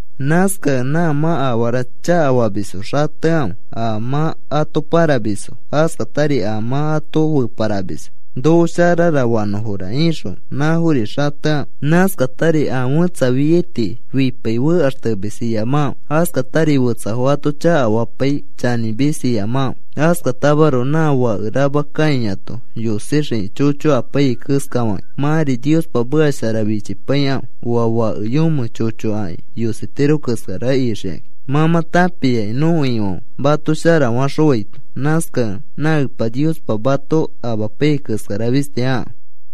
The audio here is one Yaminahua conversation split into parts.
Nãskakẽ nã mã afara chakafamisfo xatekãfe. A mã ato pãramisfo, askatari a mã ato feparamisfo: “Noko sharara fanõfora,” ixõ nãfori xatekãfe. Nãskatari a fẽtsa fiai tii fipai fekaxtemis iyamakãfe. Askatari fetsafo ato chakafapai chanĩmis iyamakãfe. Askatamaroko nã fake rama kãiato yosixiki chocho apaiyai keskafakĩ, mãri Niospa meka shara fichipaikãfe, oa fake yomẽ chocho aki yositiro keska shara ixikakĩ. Mã mã tãpiaki nõko Ifãfe mato shara faxõaito. Nãskakẽ nã Epa Niospa mato amapaiyai keskara fisti akãfe.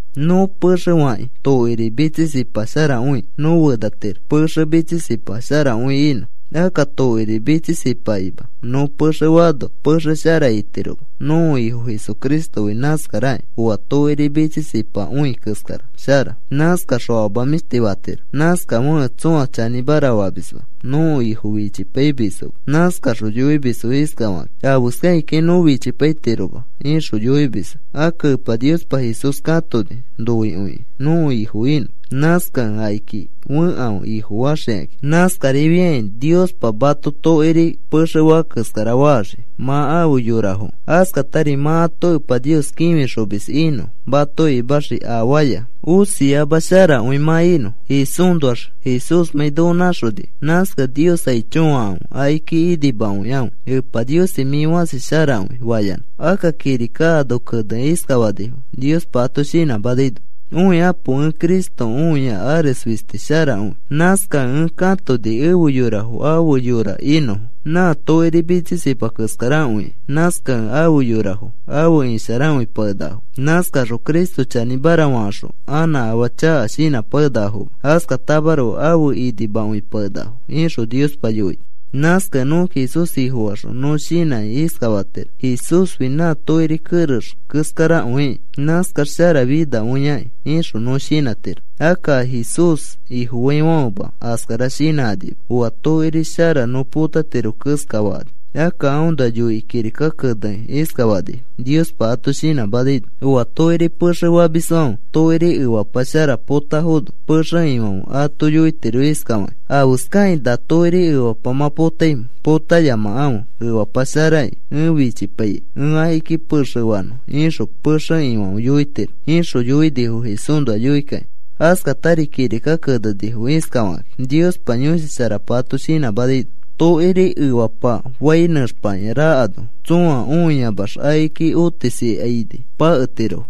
Nõ pexe fakĩ tokiri mitsisipasharakõi nõ fenatiro, pexe mitsisipa sharakõi inõ. Akka tokiri mitsisipakima nõ pexe faano pexe shara itiroma. Nõko Ifo Jesucristofi nãskarakĩ oa tokiri mitsisipakõi keskara shara. Nãskaxõ afama mĩshti fatiro. Nãskafekẽ tsõa chanĩmara famisma, nõko Ifo fichipaimisfoma. Nãskaxõ yoimisfo iskafakakĩ: “Afeskakĩkai nõ fichipaitiroma,” ixõ yoimisfo. Akka Epa Niospa Jesús katoni noikõikĩ nõko Ifo inõ. Nãskakẽ akiki fekãfe Ifofaxikakĩ. Nãskarifiakĩ Niospa mato tokiri pexefã keskara faxii mã afe yorafokẽ. Askatari mã ato Epa Nios kĩfixomis inõ mato imaxii afaaya osiama sharakõi mã inõ Jesúsnoax, Jesúsmãi noko nãxonikẽ. Nãskakẽ Nios aicho fakãfe akiki inimakõikãfe, “Epa Niosi, mĩ fasi sharakõi,” fayanã. Akka kirika ano kenekĩ iskafanifo, Niospa ato shinãmanaino: Õikapo, ẽ Cristo õia ares fisti sharakõi. Nãskakẽ ẽ katoni efe yorafo afe yora inõfo. Nã tokiri mitsisipa keskarakõiki. Nãskakẽ afe yorafo afe isharakõipakenakafo. Nãskakaxõ Cristo chanĩmara fakaxõ anã afaa chaka shinãpakenakafoma. Askatamaroko afe inimakõipakenakafo, ixõ Niospa yoini. Nãskakẽ nõ Jesús Ifofaxõ nõ shinãkĩ iskafatiro: “Jesúsfi nã tokiri kerex keskarakõikĩ, nãskax sharafinakõiaki,” ixõ nõ shinãtiro. Akka a Jesús Ifofaifãfema askara shinãkanima: “Oa tokiri shara nõ potatiro,” keskafakani. Akka aõnoa yoikĩ kirika kenekĩ iskafanifo Niospa ato shinãmanaino: Oa tokiri pexe famisfãfe tokiri efapa shara potafono, pexe ifãfe ato yoitiro iskafakĩ: “¿Afeskakĩ na tokiri efapa mã potaimẽ? Potayamakãfe, efapa sharaki. Ẽ fichipaikai ẽ akiki pexe fanõ,” ixõ pexe ifãfe yoitiro, ixõ yoinifo Jesúsnoa yoikakĩ. Askatari kirika kenenifo iskafakakĩ Niospa Yõshi Sharapa ato shinãmanaino: Tokiri efapafai nẽxpakĩa rakano tsõa õiamax akiki otisikaini paketirofo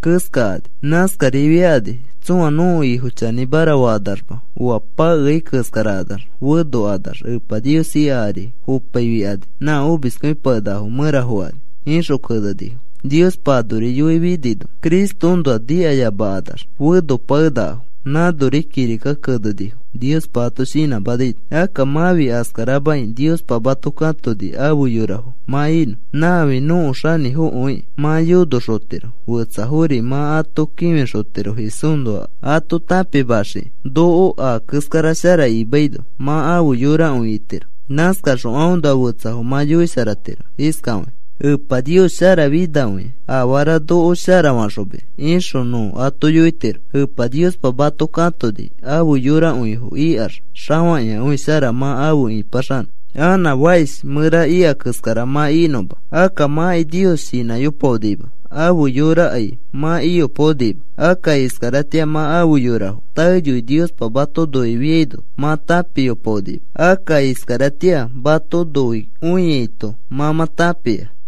keskakani. Nãskarifiakani tsõa nõko Ifo chanĩmara fakanaxma, oa pakeai keskarakanax fenokanax Epa Nios ika ari fopaifikani nã omiskõipakenakafo mẽra fokani, ixõ kenenifo. Niospa anori yoifinino Cristoõnoa nikayamakanax fenopakenakafo. Nãnori kirika kenenifo, Niospa ato shinãmanaino. Akka mãfi askaramakĩ. Niospa mato katoni afe yorafo mã inõ. Nãfi nõko Xanĩfokõikĩ mã yonoxotiro, fetsafori mã ato kĩfixotiro Jesúsnoa ato tãpimaxiki. Noko aa keskara shara imaino mã afe yorakõi itiro. Nãskaxõ aõnoa fetsafo mã yoisharatiro iskafakĩ: “Epa Nios sharafinakõia afara noko sharafaxomis,” ixõ nõ ato yoitiro. Epa Niospa mato katoni afe yorakõifo ikax xafakĩakõi shara mã afe ipaxanõ, anã fakish mẽra ika keskara mã inõma. Akka mãkai Nios shinãyopaonima, afe yorakai mã iyopaonima. Akka iskaratĩa mã afe yorafo, taeyoi Niospa mato noifiaino mã tãpiyopaonima. Akka iskaratĩa mato noikõiaito mã mã tãpia.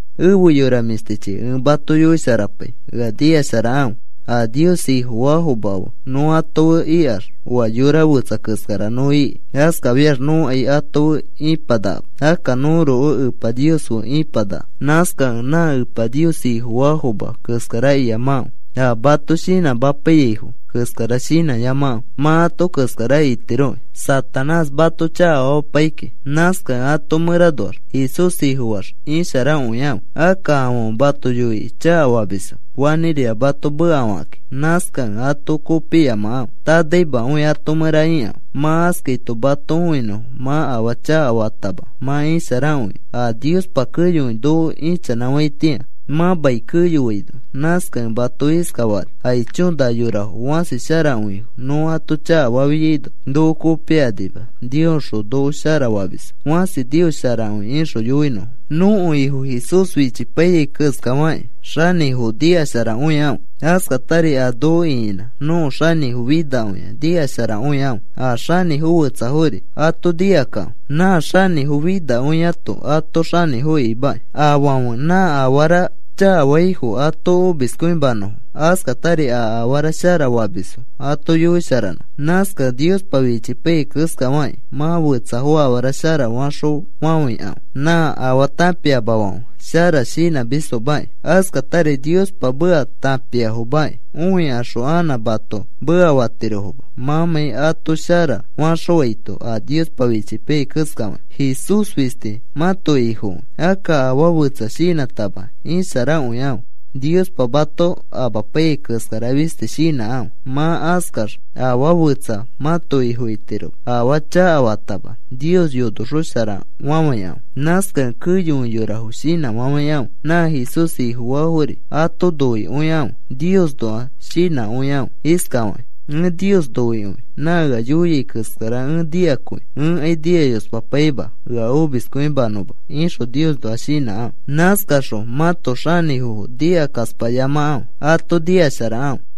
Efe yora mĩshtichi, ẽ mato yoisharapai ea nikasharakãfe. A Nios Ifofaafomafo fe nõ ato fe ikax oa yora fetsa keskara nõ iki. Askafiax nõkai ato fe ipanakama. Akka nõroko Epa Nios fe ĩpanaka. Nãskakẽ nã Epa Nios Ifofaafoma keskara iyamakãfe. A mato shinãmapaiyaifo keskara shinãyamakãfe. Mã ato keskara itiroki, Satanás mato chakafamapai kiki. Nãskakẽ ato mẽranoax Jesús Ifofaax isharakõikãfe. Akka afãfe mato yoikĩ chakafamisfo fanĩrira mato mekafakakĩ. Nãskakẽ ato kopiyamakãfe. Tanaimakõi ato mẽra ikãfe. Mã askaito mato õinõfo mã afaa chakafatama mã isharakõikẽ a Niospa keyokõi noko ichanãfaitĩa mã mai keyoaino. Nãskakẽ mato iskafakani: “Aicho, na yorafo fãsi sharakõifo, nõ ato chakafafiaino noko kopikanima, Niosxõ noko shara famisfo. Fãsi Nios sharakõi,” ixõ yoinõfo. Nõko Ifo Jesús fichipaiyai keskafakĩ, xanĩfofo nikasharakõikãfe. Askatari a noko ĩkinã nõko xanĩfo finakõia nikasharakõikãfe. A xanĩfo fetsafori ato nikakãfe. Nã xanĩfo finakõiato ato xanĩfo imakĩ, afãfe nã afara chakafaifo ato omiskõimanõfo, askatari a afara shara famisfo ato yoisharanõfo. Nãskakẽ Niospa fichipaiyai keskafakĩ mã fetsafo afara shara faxõfafãikãfe. Nã afaa tãpiamafãfe shara shinãmisfomakĩ, askatari Niospa meka tãpiafomakĩ õikaxõ anã mato mekafatirofoma mãmãi ato shara faxõaito a Niospa fichipaiyai keskafakĩ. Jesús fisti mãto Ifokõi, akka afaa fetsa shinãtama isharakõikãfe. Niospa mato amapaiyai keskara fisti shinãkãfe. Mã askax afaa fetsa mãto ifo itiroma. Afaa chakafatama Nios yonosharaxõfafãikãfe. Nãskakẽ keyokõi yorafo shinãfafãikãfe. Nã Jesús Ifofaafori ato noikõikãfe. Niosnoa shinãkõikãfe iskafakĩ: “Ẽ Nios noikõi nã ea yoiai keskara ẽ nikakõi. Ẽkai nikayospapaima ea omiskõimanõma,” ixõ Niosnoa shinãkãfe. Nãskaxõ mãto xanĩfofo nikakaspayamakãfe, ato nikasharakãfe.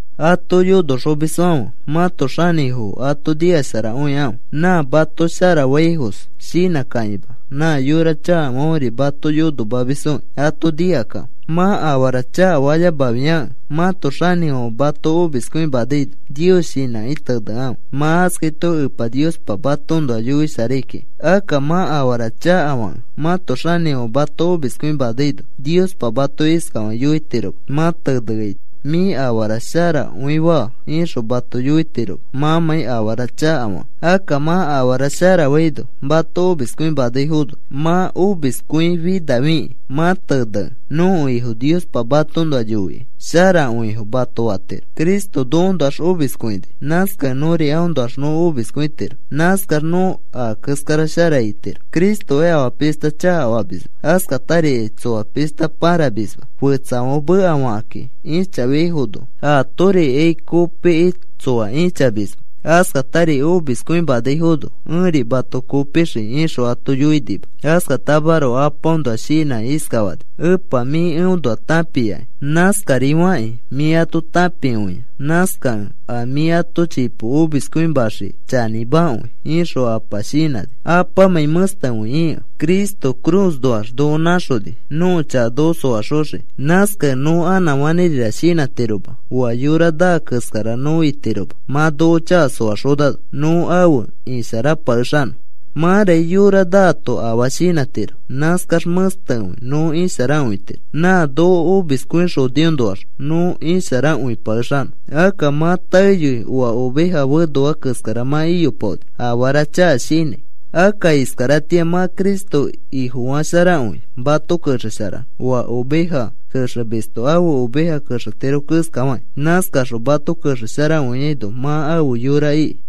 Ato yonoxomisfãfe mãto xanĩfofo ato nikasharakõikãfe. Nã mato sharafaifos shinãkakĩma. Nã yora chakafãferi mato yonomamisfoki ato nikakãfe. Mã afaa chakafayamafiakẽ mãto xanĩfãfe mato omiskõimanaino Nios shinãki tenekãfe. Mã askaito Epa Niospa matoõnoa yoisharai kiki. Akka mã afara chakafakẽ mãto xanĩfãfe mato omiskõimanaino, Niospa mato iskafakĩ yoitiroma mã teneaito: “Mĩ afara sharakõifaa,” ixõ mato yoitiroma mãmãi afara chakafakẽ. Akka mã afara sharafaino mato omiskõimanaifono mã omiskõifinafikĩ mã tenekẽ, nõko Ifo Niospa matoõnoa yoikĩ: “Sharakõifo,” mato fatiro. Cristo nokoõnoax omiskõikõini, nãskakẽ nõri aõnoax nõ omiskõitiro. Nãskax nõ aa keskara shara itiro. Cristokai afaa pishta chakafamisma, askatarikai tsoa pishta pãramisma. Fetsafãfe mekafakakĩ ĩchafiaifono, atorikai kopikĩ tsoa ĩchamisma. Askatari omiskõimanaifono, “Ẽri mato kopixii,” ixõ ato yoinima. Askatamaroko Apaõnoa shinãkĩ iskafani: “Epa, mĩ eõnoa tãpiaki. Nãskarifakĩ mĩ ato tãpikõia. Nãskakẽ a mĩ ato chipo omiskõimaxiai chanĩmakõi,” ixõ Apa shinãni, Apamãi mẽstekõi ikẽ. Cristo cruznoax noko nãxoni, nõko chaka noko soaxoxiki. Nãskakẽ nõ anã fanĩrira shinãtiro oa yora naa keskara nõ itiro mã noko chaka soaxonano nõ afe isharapakexanõ. Mãraki yora naato afaa shinãtiro. Nãskax mẽstekõi nõ isharakõitiro. Nã noko omiskõixoniõnoax nõ isharakõipakexanõ. Akka mã taeyoi oa oveja fenoa keskara mã iyopaoni afara chaka shinãi. Akka iskaratĩa mã Cristo Ifofasharakõi, mato kexesharano oa oveja kexemisto ãfe oveja kexetiro keskafakĩ. Nãskaxõ mato kexesharakõiaino mã afe yora iki.